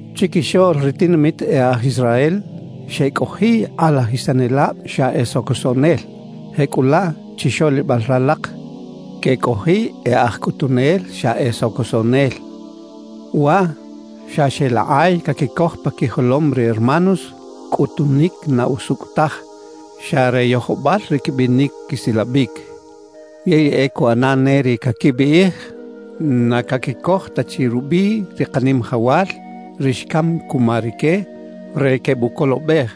Chiquixoꞌl ri tinamit e aj Israel xecꞌojiꞌ kꞌalajisanelab xa e socosoꞌnel; jecꞌulaꞌ chixoꞌlibal ralak quecꞌojiꞌ e aj cꞌutunel xa e socosoꞌnel. Waꞌ xa xeꞌlakꞌay caquicoj pa quijolom ri hermanos cꞌutunic na usucꞌ taj, xa re yojobal ri quibinic quisilabic. Yey e cuꞌana ne ri caquibiꞌij na caquicoj ta chi rubiꞌ ri Kanimajawal, ri xcam cuma rique re quebucolobej.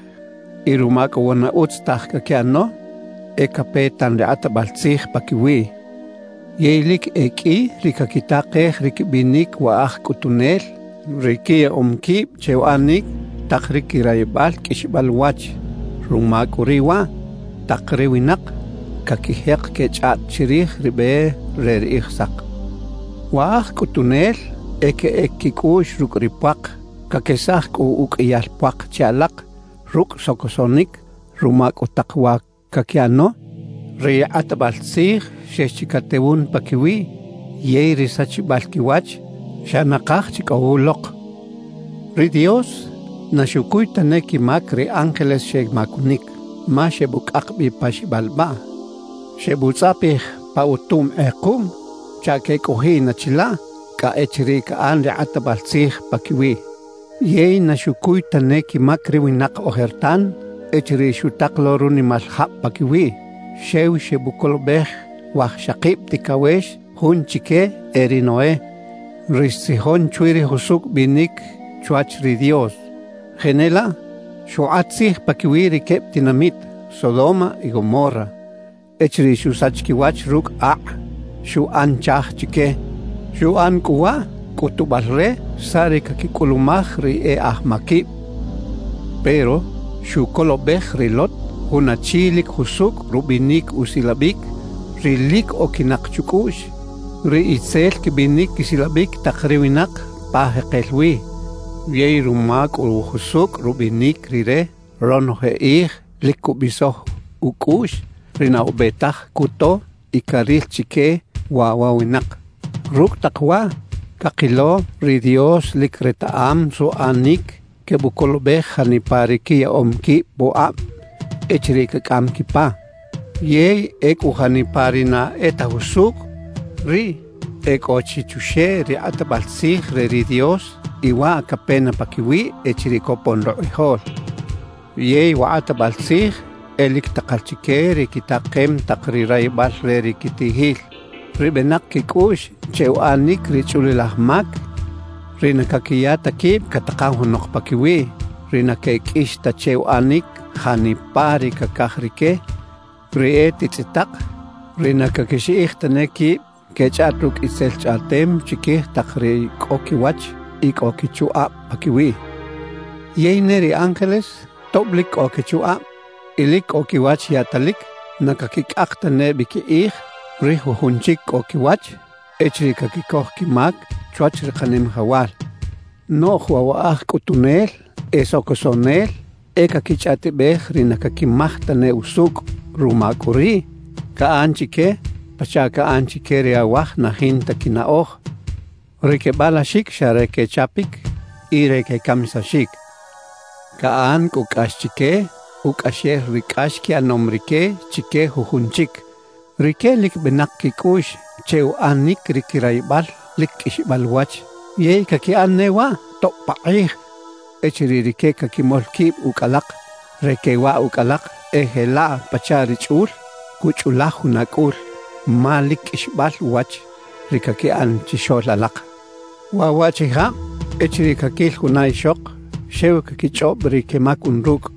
Y ruma cꞌu wa na utz taj caquiꞌano, e cape tan ri kꞌatbal tzij paquiwiꞌ. Yey lic e qꞌui ri caquitakej ri quibinic wa aj cꞌutunel, ri quiyaꞌom quib che uꞌanic tak ri quirayibal qꞌuixbal uwach. Ruma cꞌu riꞌ waꞌ, tak ri winak caquijek quechꞌaꞌt chirij ri be re ri Kꞌijsak. Wa aj cꞌutunel e queꞌec quicꞌuꞌx rucꞌ ri puak; caquesaj cꞌu uqꞌuiyal puak che alak rucꞌ socosoꞌnic. Ruma cꞌu tak wa caquiꞌano, ri kꞌatbal tzij xex chi catewun paquiwiꞌ, yey ri sachibal quiwach xa nakaj chi cꞌo wulok. Ri Dios na xucuy tane quimac ri ángeles xemacunic, ma xebucꞌak bi pa xibalbaꞌ, xebutzꞌapij pa utum kꞌekuꞌm chaꞌ quecꞌojiꞌ na chilaꞌ cꞌa echiriꞌ caꞌan ri kꞌatbal tzij paquiwiꞌ. Yey na xucuy tane quimac ri winak ojertan echiriꞌ xutak lo runimal jab paquiwiꞌ. Xew xebucolobej wajxakib ticawex; jun chique e ri Noé, ri xtzijon chwi ri jusucꞌ binic chwach ri Dios. Jenelaꞌ xukꞌat tzij paquiwi ri queb tinamit Sodoma y Gomorra echiriꞌ xusach quiwach rucꞌ akꞌ, xuꞌan chaaj chique. Xuꞌan cꞌu waꞌ cꞌutubal re saꞌ ri caquicꞌulumaj ri e aj maquib. Pero xucolobej ri Lot, jun achi lic jusucꞌ rubinic usilabic, ri lic oquinak chucꞌuꞌx ri itzel quibinic quisilabic tak ri winak pa jekel wi. Yey ruma cꞌu jusucꞌ rubinic rire, ronoje kꞌij lic cubisoj ucꞌuꞌx ri na ube taj cuto y caril chique waꞌ wa winak. Rucꞌ tak waꞌ, cakilo ri Dios lic retaꞌam suꞌanic quebucolobej janipa ri quiyaꞌom quib pukꞌab echiriꞌ cacꞌam quipa; yey ecꞌu janipa ri na e ta jusucꞌ, riꞌ e cꞌo chi chuxeꞌ ri kꞌatbal tzij re ri Dios, y waꞌ cape na paquiwiꞌ echiriꞌ copon rukꞌijol. Yey wa kꞌatbal tzij e lic takal chique ri quitakem tak ri rayibal re ri quitiꞌjil, ri benak quicꞌuꞌx che uꞌanic ri chꞌulilaj mac, ri na caquiya ta quib catakan junok paquiwiꞌ, ri na queqꞌuix ta che uꞌanic janipa ri cacaj rique, ri e titzꞌitak, ri na caquixiꞌij tane quib quechꞌaꞌt rucꞌ itzel chꞌaꞌtem chiquij tak ri cꞌo quiwach y cꞌo quichukꞌab paquiwiꞌ. Yey ne ri ángeles, tob lic cꞌo quichukꞌab y lic cꞌo quiwach yaꞌtalic, na caquicꞌak tane bi quikꞌij ri jujun chic cꞌo quiwach echiriꞌ caquicoj quimac chwach ri Kanimajawal. Noꞌj waꞌ wa aj cꞌutunel e socosoꞌnel, e caquichꞌaꞌtibej ri na caquimaj tane usucꞌ. Ruma cꞌu riꞌ, caꞌan chique pachaꞌ caꞌan chique ri awaj na jinta quinaꞌoj, ri quebalaxic xa re quechapic y re quecamisaxic. Caꞌan cꞌu cꞌax chique, ucꞌaxel ri cꞌax quiꞌanom rique chique jujun chic. Rique lic benak quicꞌuꞌx che uꞌanic ri quirayibal lic qꞌuixbal uwach yey caquiꞌan ne waꞌ tob pakꞌij. Echiriꞌ rique caquimol quib ucꞌ alak re quewaꞌ ucꞌ alak, e jelaꞌ pachaꞌ ri chꞌul cuchꞌulaj juna cꞌul, ma lic qꞌuixbal uwach ri caquiꞌan chixoꞌl alak. Waꞌ waꞌchijab echiriꞌ caquil juna ixok, xew caquichꞌob ri quemacun rucꞌ,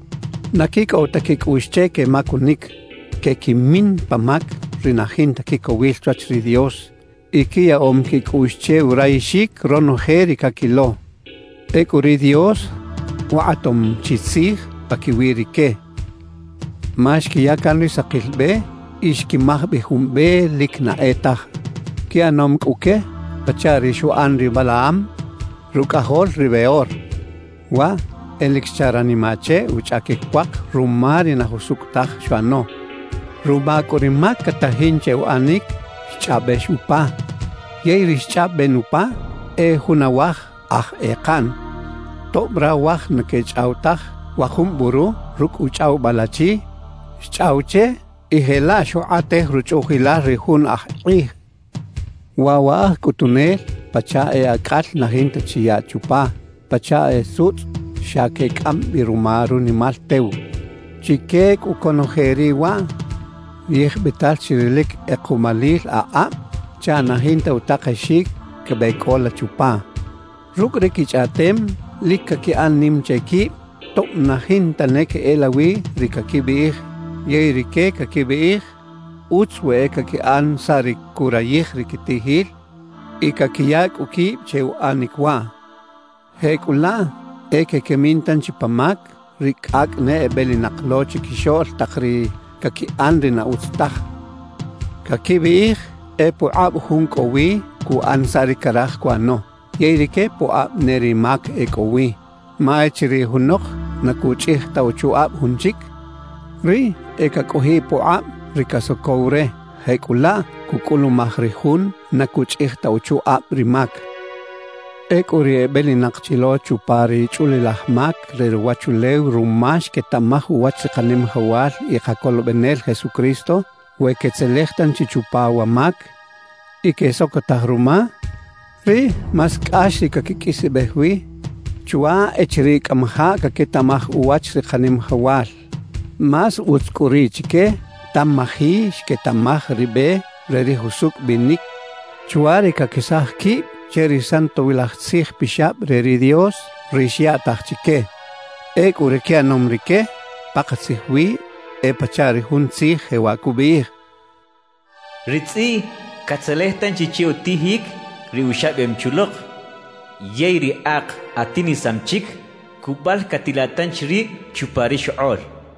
na quicꞌow ta quicꞌuꞌx che quemacunic, quequimin pa mac ri na jinta quicowil chwach ri Dios y quiyaꞌom quicꞌuꞌx che urayixic ronoje ri caquilo. Ecꞌu ri Dios ukꞌatom chi tzij paquiwi rique ma xquiya can ri sakil be y xquimaj bi jun be lic na e taj. Quiꞌanom cꞌu que pachaꞌ ri xuꞌan ri Balaam, rucꞌajol ri Beor. Waꞌ e lic xcha ranimaꞌ che uchꞌaquic puak ruma ri na jusucꞌ taj xuꞌano. Ruma cꞌu ri mac catajin che uꞌanic, xchꞌaꞌbex upa, yey ri xchꞌaꞌben upa ¡e jun awaj aj ekaꞌn! Tob rawaj na quechꞌaw taj, wa jun buru rucꞌ uchꞌawibal achi xchꞌaw che y jelaꞌ xukꞌatej ruchꞌuꞌjilal ri jun aj kꞌij. Waꞌ wa aj cꞌutunel pachaꞌ e acꞌal na jinta chi yaꞌ chupa, pachaꞌ e sutzꞌ xa quecꞌam bi ruma runimal tew. Chique cꞌu conoje riꞌ waꞌ, yijbital chi ri lic kꞌekuꞌmalil akꞌab chaꞌ na jinta utakexic quebeꞌcꞌola chupa. Rucꞌ ri quichꞌaꞌtem lic caquiꞌan nim che quib tob na jinta ne queꞌelawi ri caquibiꞌij. Yey rique caquibiꞌij utz we e caquiꞌan saꞌ ri curayij ri quitiꞌjil y caquiya cꞌu quib che uꞌanic waꞌ. Jecꞌulaꞌ e quequimin tanchi pa mac ri cꞌacꞌ ne ebelinak lo chiquixoꞌl tak ri caquiꞌan ri na utz taj. Caquibiꞌij e pukꞌab jun cꞌo wi cuꞌan saꞌ ri caraj cuꞌano; yey rique pukꞌab ne ri mac e cꞌo wi. Ma echiriꞌ junok na cuchꞌij ta uchukꞌab jun chic, riꞌ e cacꞌojiꞌ pukꞌab ri casocow re; jecꞌulaꞌ cucꞌulumaj ri jun na cuchꞌij ta uchukꞌab ri mac. Ecꞌu ri ebelinak chi lo chupa ri chꞌulilaj mac re ruwachulew ruma xquetaꞌmaj uwach ri Kanimajawal y Kacolobenel Jesucristo, we quetzelej tanchi chupa wa mac y quesocotaj ruma, riꞌ más cꞌax ri caquiqꞌuisbej wi chwa echiriꞌ cꞌamajaꞌ caquetaꞌmaj uwach ri Kanimajawal. Más utz cꞌu riꞌ chique tamaji xquetaꞌmaj ri be re ri jusucꞌ binic chwa ri caquesaj quib che ri Santowilaj Tzij Pixab re ri Dios, ri xyaꞌtaj chique. Ecꞌu ri quiꞌanom rique, pakatzij wi e pachaꞌ ri jun tzij jewaꞌ cubiꞌij: Ri tzꞌiꞌ catzelej tanchi che utijic ri uxabem chi ulok; yey ri ak atinisam chic, cubalcatilaꞌ tanchi rib chupa ri xokꞌoꞌl cachaꞌ.